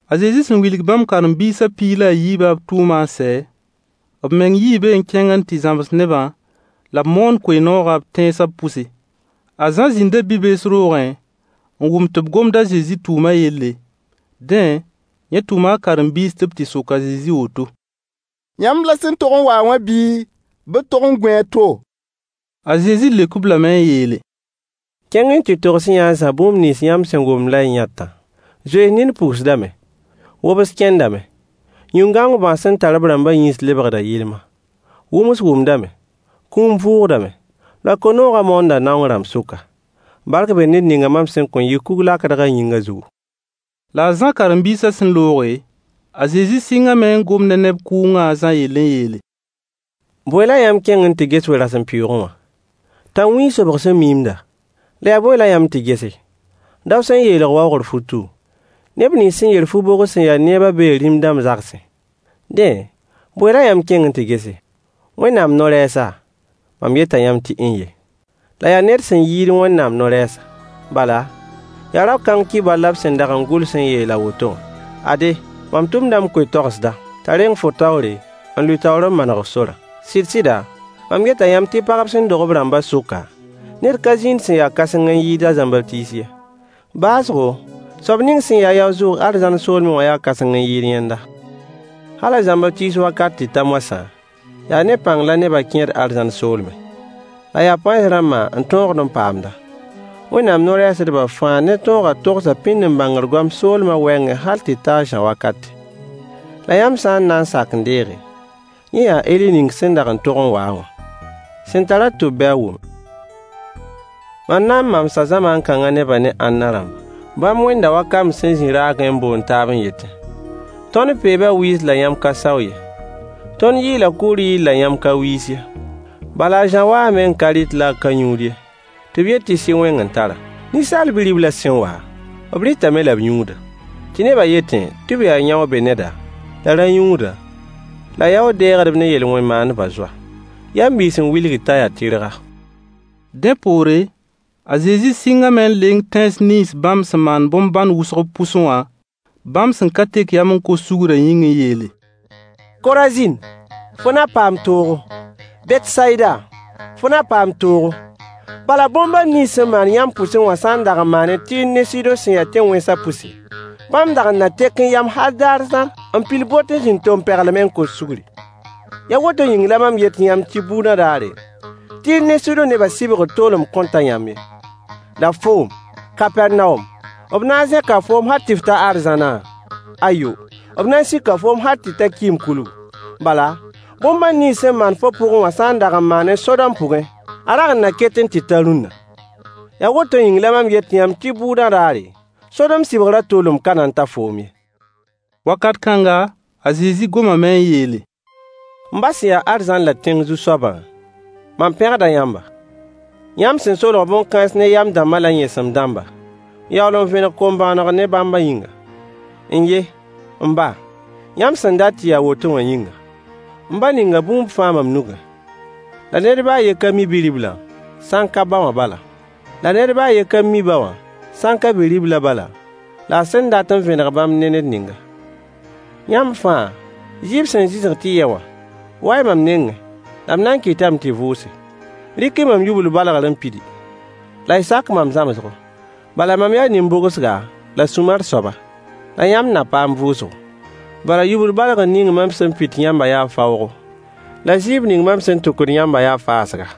A Zezi sẽn wilg bãmb karen-biisã piig la a yiibã b tʋʋmã n sɛ, b meng yii be n kẽng n tɩ zãms nebã la b moon koe-noogã b tẽnsã pʋse. A Zã zĩnda bi-bees roogẽ n wʋm tɩ b gomd a Zezi tʋʋmã yelle. Dẽ, yẽ tʋma a karen-biis tɩ b tɩ sok a Zezi woto: Yãmb la sẽn tog n wa-a wã bii, bɩ d tog n gũ a to? A Zezi leok-b lame n yeele: Kẽng-y n tɩ togs-y-yã a Zã bũmb nins yãmb sẽn wʋmd la y yãtã: zoens nin pugsdame, wobs kẽndame, yĩn-gãong bãas sẽn tar b rãmbã yĩns lebgda yɩlma, wʋms wʋmdame, kũum vʋʋgdame, la koe-noogã moonda naong rãmb sʋka. Bark bee ned ning mam sẽn kõn yɩ kug-lakdg a yĩngã zugu. La a Zã karen-biisã sẽn looge, a Zezi sɩngame n gom ne neb kʋʋngã a Zã yell n yeele: Bõe la yãmb kẽng n tɩ ges we-rasempʋɩɩgẽ wã? Tãnwĩig sobg sẽn miimda? La yaa bõe la yãmb tɩ gese? Dao sẽn yeelg waoogr futu? Neb nins sẽn yer fu-bʋgs sẽn ya neebã bee rĩm-dãmb zagsẽ. Dẽ, bõe la yãmb kẽng n tɩ gese? Wẽnnaam no-rɛɛsa? Mam yeta yãmb tɩ n-ye. La yaa ned sẽn yɩɩd Wẽnnaam no-rɛɛsa. Bala, yaa rao-kãng kibar la b sẽn dag n gʋls n yeel a woto wã: “Ade, mam tʋmda m koe-toagsda, t'a reng fo taoore, n lʋɩ taoor n maneg f sorã.” Sɩd-sɩda, mam yeta yãmb tɩ pagb sẽn dog b rãmbã sʋka, ned ka zĩnd sẽn ya kãseng n yɩɩd a Zãmbatiis ye. Baoosgo, soab ning sẽn ya-a yao-zʋʋg arzãn soolmẽ wã yaa kãseng n yɩɩd yẽnda. Hal a Zãmbatiis wakat tɩ ta moasã, yaa ne pãng la nebã kẽed arzãn soolmẽ. La yaa pãens rãmbã n tõogd n paamd-a. Wẽnnaam no-rɛɛsdbã fãa ne tõogã togsa pĩnd-n-bãngr goam soolmã wɛɛngẽ hal tɩ ta a Zã wakate. La yãmb sã n na n sak n deege, yẽ yaa Eli ning sẽn dag n tog n wa-a wã. Sẽn tar-a tʋb bɩ a wʋme. Mam na n mamsa zamaan-kãngã nebã ne ãnna rãmba? Bãmb wẽnda wa kamb sẽn zĩ raagẽ n boond taab n yetẽ: “Tõnd peeba wɩɩs la yãmb ka sao ye. Tõnd yɩɩla kʋʋr yɩɩl la yãmb ka wiis ye.” Bala a Zã waame n ka rɩt la a ka yũud ye, tɩ b yet tɩ sɩ-wẽng n tar-a. Ninsaal Bi-riblã sẽn wa, b rɩtame la b yũuda, tɩ nebã yetẽ tɩ b yaa yão-be-neda, la rã-yũuda, la yaood-dɛɛgdb ne yel-wẽn maandb zoa. Yam biis n wilgd t'a yaa tɩrga. Dẽ poore, a Zezi sɩngame n leng tẽns nins bãmb sẽn maan bõn-bãn wʋsg b pʋsẽ wã, bãmb sẽn ka tek yam n kos sugrã yĩng n yeele: Korazin, fo na paam toogo! Betsayida, fo na paam toogo! Bala bõn-bãn nins sẽn maan yãmb pʋsẽ wã sã n dag n maanẽ Tɩɩr ne Sɩdõ sẽn ya tẽn-wẽnsã pʋse, bãmb dag n na tekẽ yam hal daar zãr n pil bot n zĩnd tompeglmẽ n kos sugri. Yaa woto yĩng la mam yet yãmb tɩ bʋʋdã daare, Tɩɩr ne Sɩdõ nebã sɩbgrã toolem kõn ta yãmb ye. La foom, Kapɛrnawom, b na n zẽka foom hal tɩ f ta arzãna? Ayo, b na n sika foom hal tɩ ta kɩɩm-kulgu. Bala bõn-bãn nins sẽn maan fo pʋgẽ wã sã n dag n maanẽ Sodom pʋgẽ, a rag n na ketẽ tɩ ta rũnna. Yaa woto yĩng la mam yet yãmb tɩ bʋʋdã daare, Sodom sɩbgrã toolem ka na n ta foom ye. Wakat kãnga, a Zezi gomame n yeele: M ba sẽn ya arzãn la tẽng Zu-soabã, mam pẽgda yãmba, yãmb sẽn solg bõn-kãens ne yam-dãmba la yẽesem-dãmba, n yaool n vẽneg kom-bõonegã ne-bã yĩnga. N-ye, m ba, yãmb sẽn dat tɩ ya a woto wã yĩnga. M ba ninga bũmb fãa mam nugẽ, la ned ba a yen ka mi Bi-riblã, sã n ka ba wã bala. La ned ba a yen ka mi ba wã, sã n ka Bi-riblã bala, la a sẽn dat n vẽneg bãmb ne ned ningã. Yãmb fãa, zɩɩb sẽn zɩsg tɩ y yɛ wã, wa-y mam nengẽ, la m na n kɩtame tɩ y vʋʋse. Rɩk-y mam yubl-balgr n pidi, la y sak mam zãmsgo, bala mam yaa nin-bʋgsga la sũ-mar soaba, la yãmb na paam vʋʋsgo. Bala yubl-balgr ning mam sẽn pit yãmbã yaa faoogo, la zɩɩb ning mam sẽn tʋkd yãmbã yaa faasga.